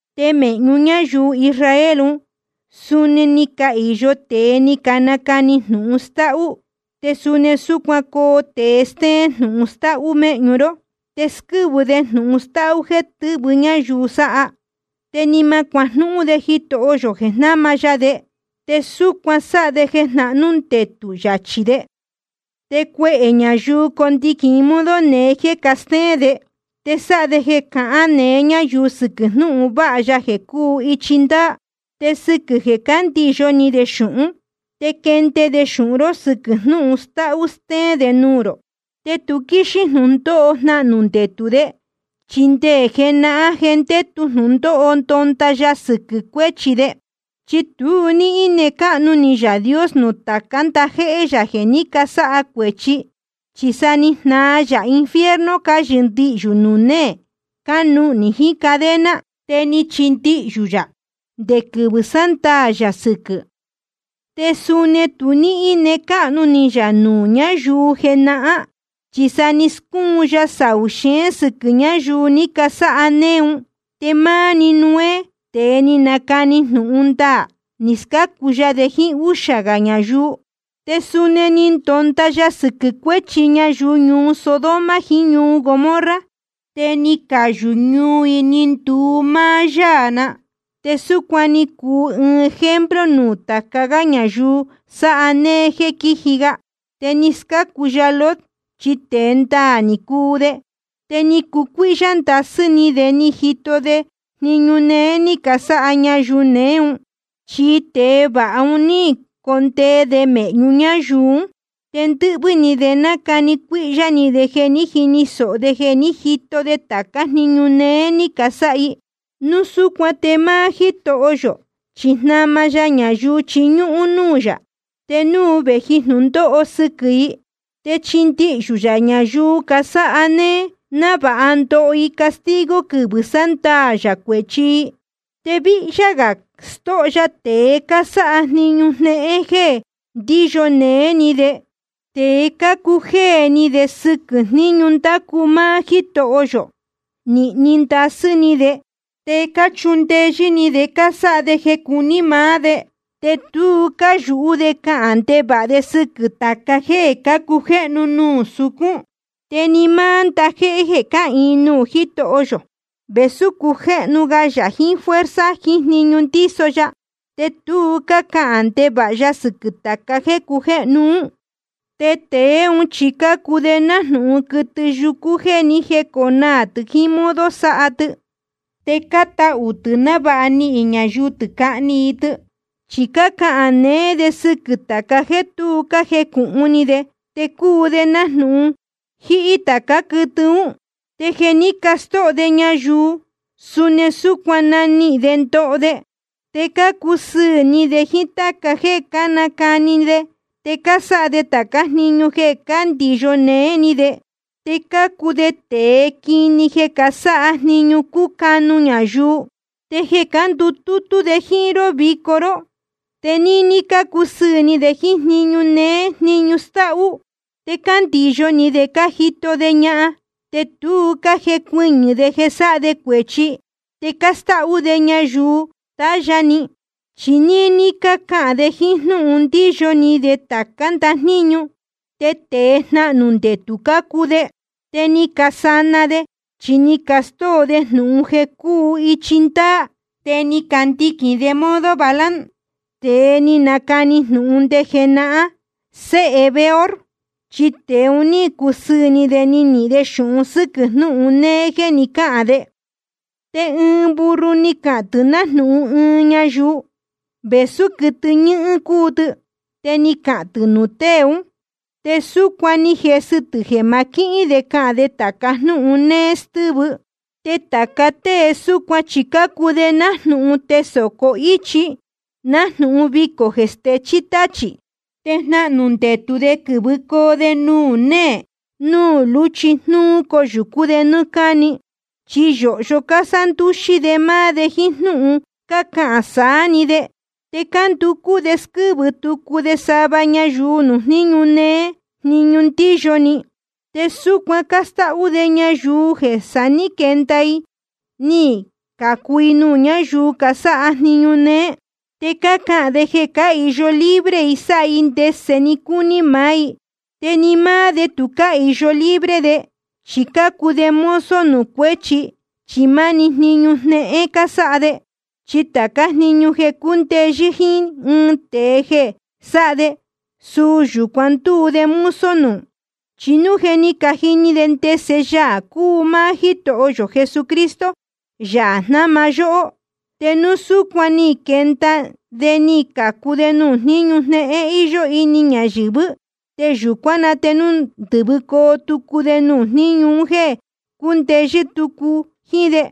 Te mēhñu ñáyuu Israel ún suni ni cahīyo tēe ni canacani jnūhun stáhú. Te suni súcuan coo tēe stéén jnūhun stáhú méhñu ró. Te squɨ́vɨ de jnūhun stáhú jéē tɨ́vɨ ñáyuu sáha. Te ni ma cuajnúhún de Jitoho yō jeē jnáma ya de, te súcuan sáha de jeē jnahnú ndetū yachī de. Te cuehē ñayuu condiquīn i modo neé jéē castéén de. Te sáha de jeē cahán neé ñáyuu sɨquɨ̄ jnúhun vāha ya jeē cúu ichi ndaā. Te sɨquɨ̄ jeē cándiyo ni de xūhún, te quende de xūhun ró sɨquɨ̄ jnúhun stáhú stéén de nuū rō. Te tu quíxín jnūndóho jnahnū ndetū de, chi nde jenahán je ndétu jnūhun ndonda ya sɨquɨ̄ cuéchi de. Chi tu ní íne cáhnu ni Yaā Dios nuū tācá ndajéhé yā jeē ní casáha cuēchi, chi sa ni jnaa yā infierno cáyɨndihyū nuū néē, cánuhnī jiín cadena. Te ni chindihyū yā nde quɨvɨ̄ sándaā yā sɨquɨ̄. Te suni tu ní íne cáhnu ni yā nuū ñáyuu jenahán, chi sa ni scúun ya saū xeén sɨquɨ̄ ñáyuu ni casáha néé un. Te máá‑ni Noé, tēe ni nacani jnūhun ndaā, ni scácu ya de jíín úxā gā ñayuu. Te suni ni ndonda ya sɨquɨ̄ cuéchi ñayuu ñuu Sodoma jiín ñuu Gomorra, te ni cayū ñuu i ni nduu máá yáā na. Te súcuan cúu i ɨɨn ejemplo nuū tāca gá ñayuu sáha néé jéē quíji ga. Te ni scácu ya Lot, chi tēe ndaā ni cuu de, te ni cucuíhyá ndasɨ́ ni de ni jito de jniñu néé ní casáha ñayuu neé un. Chi tēe váha un ní condee de mēhñu ñáyuu ún, te ndɨquɨvɨ̄ ni nacani cuíhyá ni de jeē ní jini sōho de ni jito de tācá jniñu néé ní casáha i. Núu súcuan te máá Jítoho yō chi jnáma ya ñayuu cáchiñúhún núū yā, te núu vēji jnūndóho sɨquɨ̄ i. Te chíndihyū yā ñayuu casáha néé, návāha ndoho i castigo quɨvɨ̄ sándaā yā cuēchi i. Te víhyá gā stóho ya tēe cásáha jniñu jnéhén jéē ndíyo néé ni de, te cácuu jéē ni de sɨquɨ̄ jníñu ndácu máá Jítoho yō. Nīhni ndasɨ́ ni de, te cáchundeyɨ́ ni de sáha de jeē cácuni maá de, te tu cáyūhú de cahān ndevāha de sɨquɨ̄ tāca jéē cácujéhnu nuū sucún. Te ni máá ndajéhé jeē cáhīin nuū Jitoho yō, vēsú cácujéhnu ga yā jiín fuerza jiín jniñu ndíso ya, te tu cácahān ndevāha ya sɨquɨ̄ tāca jéē cácujéhnu ún. Te tēe ún chi cácuu de nájnūhun quɨtɨ yúcú jéē ni jéconaā tɨ̄ jiín modo sáha tɨ, te cátahū tɨ̄ návāha nihīn ñayuu tɨ̄ cahni i tɨ. Chi cácahān neé de sɨquɨ̄ tāca jéē tu cájecūhun ni de. Te cuu de nájnūhun jíhí tācá quɨtɨ ún. Te jeē ní castóho de ñayuu, suni súcuan nanihīn de ndoho de. Te cácusɨɨ̄ ni de jíín táca jéē cácajni ni de, te cásáha de tācá jniñu jeē cándiyo néé ni de. Te cácuu de tēe quini jeē casáha jniñu cúcanu ñayuu. Te jeē cándutútú de jíín ró vico ró, te níní cácusɨɨ̄ ni de jíín jniñu néé jniñu stáhú. Te cándiyo ni de cájito de ñahan, te tu cájecuɨñɨ̄ de sáha de cuēchi. Te cástáhú de ñayuu tahya ni. Chi ni cacāan de jíín jnúhun ndíyo ni de tācá ndajníñu. Te tēe jnahnū ndetū cácuu de. Te ni casana de, chi ni castóo de jnūhun jeē cúu ichi ndaā. Te ni candiquīn de modo Balaam, tēe ni nacani jnūhun nde jenahán, séhe Beor. Chi tēe un ní cusɨɨ̄ ni de nihīn de xūhun sɨ́quɨ̄ jnūhun néé jéē cahán de. Te ɨɨn burro ni cahān tɨ̄ nájnūhun ɨɨn ñayuu, vēsú quɨtɨ ñɨhɨ́n cúu tɨ. Te ni cahān tɨ̄ nuū tée ún, te súcuan ni jesɨ tɨ̄ jeē ma quihín de cahān de tāca jnúhun néé stɨ́vɨ. Te tāca tée súcuan chi cácuu de nájnūhun tesōco íchi, nájnūhun vicō jeē stechí táchī. Te jnahnū ndetū de quɨ̄vɨcoo de nuū néē nuū lúchi jnúú coyūcú de nɨ́ɨ́ cáni. Chi yōhyo cásándúxí de máá de jíín jnúhun cácahān saá‑ni de. Te cánducú de squɨ́vɨ tucu de sava ñayuu nuū jniñu néé jniñu ndíyo ni. Te súcuan cástáhú de ñayuu jeē sa ní quenda i ni cācu i nuū ñáyuu casáha jniñu néé. Te cácahān de jeē cáhīyo libre i sáha i ndese‑ni cúní maá i, te ni máá de tu cáhīyo libre de, chi cácuu de mozo nuū cuéchi, chi máni jniñu jnéhén cásáha de. Chi tācá jniñu jeē cúndeyɨ́ jíín ɨɨn tēe jeē sáha de, suu yūcuan ndúu de mozo nuū. Chi núu je ni cajini de ndese Yaā cúu máá Jítoho yō Jesucristo, Yaā jnáma yóhó, te núu súcuan ni quenda de ni cācu de nuū jníñu jnéhén íyó ini ñayɨ̄vɨ́, te yūcuán na te núu ndɨ́vɨcoo tucu de nuū jníñu un jéē cúndeyɨ́ tucu jíín de,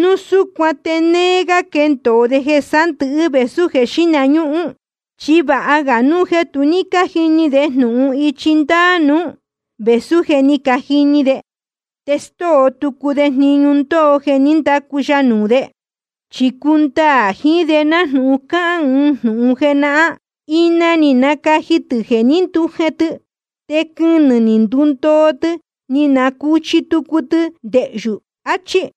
núu súcuan te néé gá quendōo de jeē sándɨ̄hɨ́ vēsú jeē xíhna ñúhún. Chi vāha ga núu jeē tu ní cájini de jnūhun ichi ndaā nuú, vēsú jeē ní cajini de, te stóo tucu de jniñu ndoo jeē ní ndacu ya nuū de. Chi cúndaā jiín de nájnūhun cáhán ɨɨn jnūhun jenahán: Ina ni nacaji tɨ̄ jeē ní ndujen tɨ. Te quɨnɨ̄ ní ndundoo, ni nacuchi tucu tɨ ndehyū, achí.